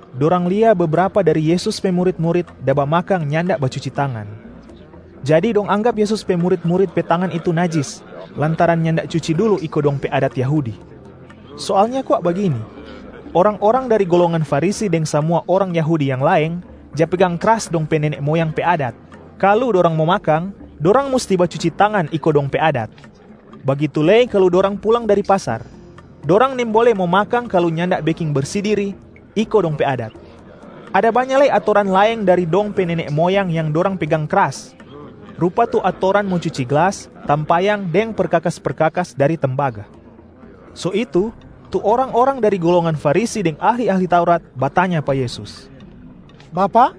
Dorang lia bebrapa dari Yesus pe murit-murit da bamakang nyanda bacuci tangan, jadi dong anggap Yesus pe murit-murit pe tangan itu najis lantaran nyanda cuci dulu iko dong pe adat Yahudi. Soalnya kwa bagini: orang-orang dari golongan Farisi deng samua orang Yahudi yang laeng ja pegang kras dong pe nene moyang pe adat. Kalu dorang mo makang, dorang musti bacuci tangan iko dong pe adat. Bagitu lei kalu dorang pulang dari pasar, dorang nimbole mo makang kalu nyanda beking bersi diria iko dong pe adat. Ada banya lei atoran laeng dari dong pe nene moyang yang dorang pegang kras, rupa tu atoran mo cuci glas, tampayang deng perkakas-perkakas dari tembaga. So itu, tu orang-orang dari golongan Farisi deng ahli-ahli Taurat batanya pa Yesus, “Bapak,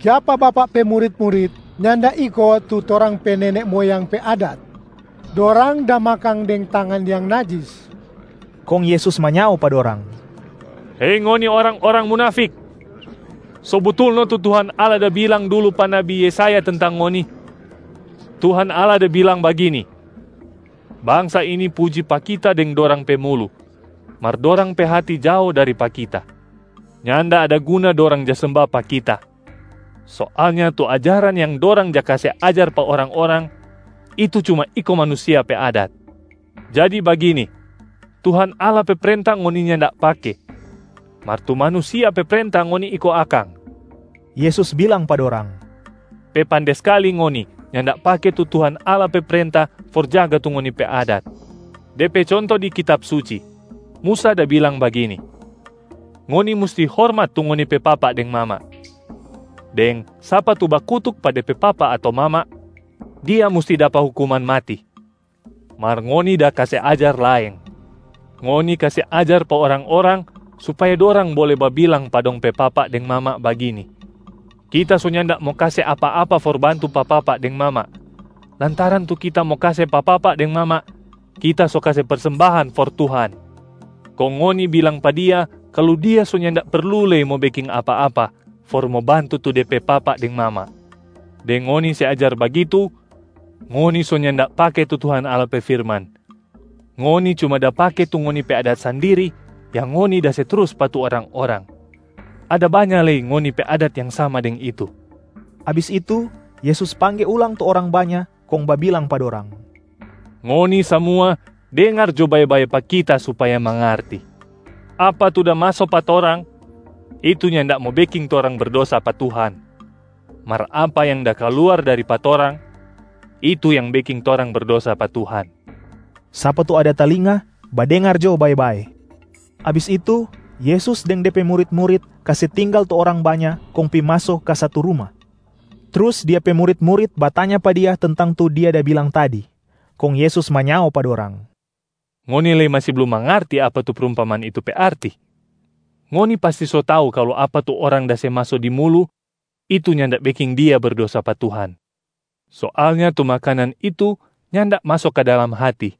kiapa Bapak pe murit-murit nyanda iko tu torang pe nene moyang pe adat? Dorang da makang deng tangan yang najis.” Kong Yesus manyao pa dorang, “Hei ngoni orang-orang munafik! So butul no tu Tuhan Allah da bilang dulu pa nabi Yesaya tentang ngoni. Tuhan Allah da bilang bagini, ‘Bangsa ini puji pa Kita deng dorang pe mulu, mar dorang pe hati jao dari pa Kita. Nyanda ada guna dorang ja semba pa Kita. Soalnya tu ajaran yang dorang ja kase ajar pa orang-orang, itu cuma iko manusia pe adat.’ Jadi bagini, Tuhan Allah pe prenta ngoni nyanda pake, mar tu manusia pe prenta ngoni iko akang.” Yesus bilang pa dorang, “Pe pande skali ngoni nyanda pake tu Tuhan Allah pe prenta for jaga tu ngoni pe adat. De pe conto di kitab Suci, Musa da bilang bagini, ‘Ngoni musti hormat tu ngoni pe papa deng mama,’ deng ‘Sapa tu bakutuk pa de pe papa ato mama, dia musti dapa hukuman mati.’ Mar ngoni da kase ajar laeng. Ngoni kase ajar pa orang-orang supaya dorang bole babilang pa dong pe papa deng mama bagini, ‘Kita so nyanda mo kase apa-apa for bantu pa papa deng mama, lantaran tu kita mo kase pa papa deng mama, kita so kase persembahan for Tuhan.’ Kong ngoni bilang pa dia kalu dia so nyanda perlu lei mo beking apa-apa for mo bantu tu de pe papa deng mama. Deng ngoni se ajar bagitu, ngoni so nyanda pake tu Tuhan Allah pe firman, ngoni cuma da pake tu ngoni pe adat sandiri yang ngoni da se trus pa tu orang-orang. Ada banya lei ngoni pe adat yang sama deng itu.” Abis itu Yesus pangge ulang tu orang banya kong babilang pa dorang, “Ngoni samua dengar jo bae-bae pa Kita supaya mangarti. Apa tu da maso pa torang, itu nyanda mo beking torang berdosa pa Tuhan. Mar apa yang da kaluar dari pa torang, itu yang beking torang berdosa pa Tuhan.” [ Sapa tu ada talinga, badengar jo bae-bae!] Abis itu Yesus deng De pe murit-murit kase tinggal tu orang banya kong pi maso ka satu ruma. Trus Dia pe murit-murit batanya pa Dia tentang tu Dia da bilang tadi. Kong Yesus manyao pa dorang, “Ngoni lei masi blum mangarti apa tu prumpamaan itu pe arti? Ngoni pasti so tau kalu apa tu orang da se maso di mulu, itu nyanda beking dia berdosa pa Tuhan. Soalnya tu makanan itu nyanda maso ka dalam hati,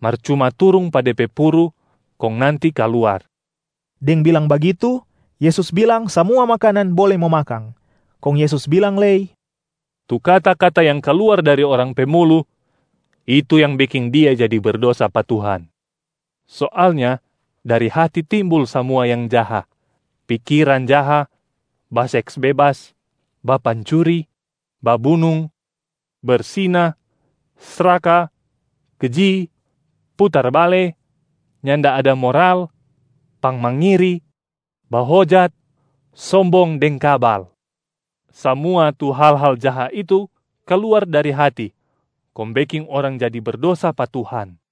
mar cuma turung pa de pe puru kong nanti kaluar.” Deng bilang bagitu, Yesus bilang samua makanan bole mo makang. Kong Yesus bilang lei, “Tu kata-kata yang kaluar dari orang pe mulu, itu yang beking dia jadi berdosa pa Tuhan. Soalnya dari hati timbul samua yang jaha: pikiran jaha, baseks bebas, bapancuri, babunung, bersina, sraka, keji, putar-bale, nyanda ada moral, pangmangiri, bahojat, sombong deng kabal. Samua tu hal-hal jaha itu kaluar dari hati kong beking orang jadi berdosa pa Tuhan.”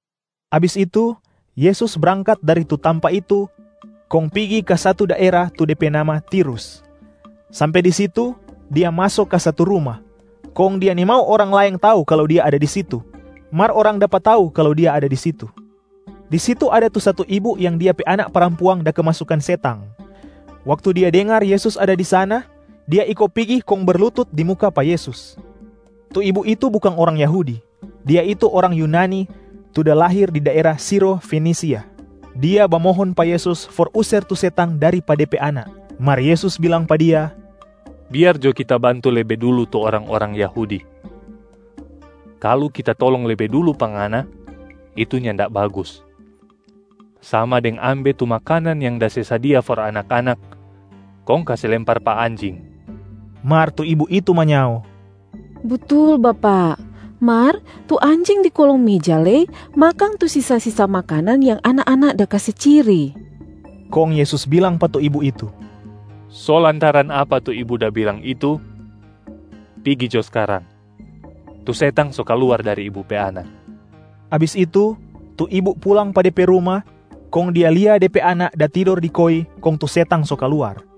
Abis itu, Yesus brangkat dari tu tampa itu kong pigi ka satu daera tu de pe nama Tirus. Sampe di situ Dia maso ka satu ruma, kong Dia nimau orang laeng tau kalu Dia ada di situ. Mar orang dapa tau kalu Dia ada di situ. Di situ ada tu satu ibu yang Dia pe anak parampuang da kemasukan setang. Waktu dia dengar Yesus ada di sana, dia iko pigi kong berlutut di muka pa Yesus. Tu ibu itu bukang orang Yahudi, dia itu orang Yunani tu da lahir di daera Siro Fenisia. Dia bamohon pa Yesus for user tu setang dari pa de pe anak. Mar Yesus bilang pa dia, “Biar jo Kita bantu lebe dulu tu orang-orang Yahudi. Kalu Kita tolong lebe dulu pa ngana, itu nyanda bagus, sama deng ambe tu makanan yang da se sadia for anak-anak kong kase lempar pa anjing.” Mar tu ibu itu manyao, “Butul Bapak, mar tu anjing di kolong meja lei makang tu sisa-sisa makanan yang anak-anak da kase ciri.”b Kong Yesus bilang pa tu ibu itu, “So lantaran apa tu Ibu da bilang itu, pigi jo skarang, tu setang so kaluar dari ibu pe anak.” Abis itu, tu ibu pulang pa de pe ruma, kong dia lia de pe anak da tidor di koi kong tu setang so kaluar.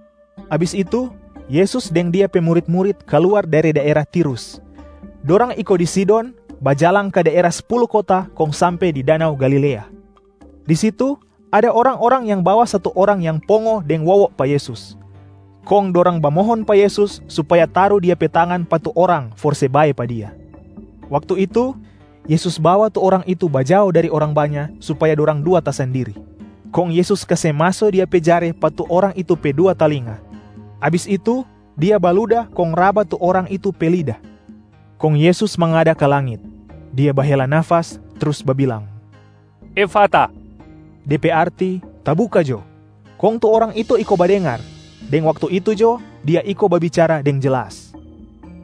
Abis itu, Yesus deng Dia pe murit-murit kaluar dari daera Tirus. Dorang iko di Sidon, bajalang ka daera Spulu Kota kong sampe di danau Galilea. Di situ ada orang-orang yang bawa satu orang yang pongo deng wowo pa Yesus, kong dorang bamohon pa Yesus supaya taru Dia pe tangan pa tu orang for se bae pa dia. Waktu itu Yesus bawa tu orang itu bajao dari orang banya supaya dorang dua tasandiri. Kong Yesus kase maso Dia pe jare pa tu orang itu pe dua talinga, abis itu Dia baluda kong raba tu orang itu pe lida. Kong Yesus mangada ka langit, Dia bahela nafas trus babilang, “Efata!” de pe arti ‘Tabuka jo’! Kong tu orang itu iko badengar, deng waktu itu jo dia iko babicara deng jelas.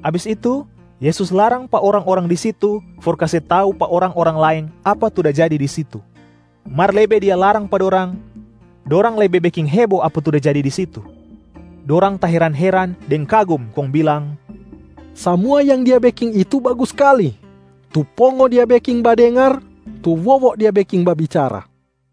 Abis itu Yesus larang pa orang-orang di situ for kase tau pa orang-orang laeng apa tu da jadi di situ. Mar lebe Dia larang pa dorang, dorang lebe beking hebo apa tu da jadi di situ. Dorang taheran-heran deng kagum kong bilang, “Samua yang Dia beking itu bagus skali. Tu pongo Dia beking badengar, tu wowo Dia beking babicara.”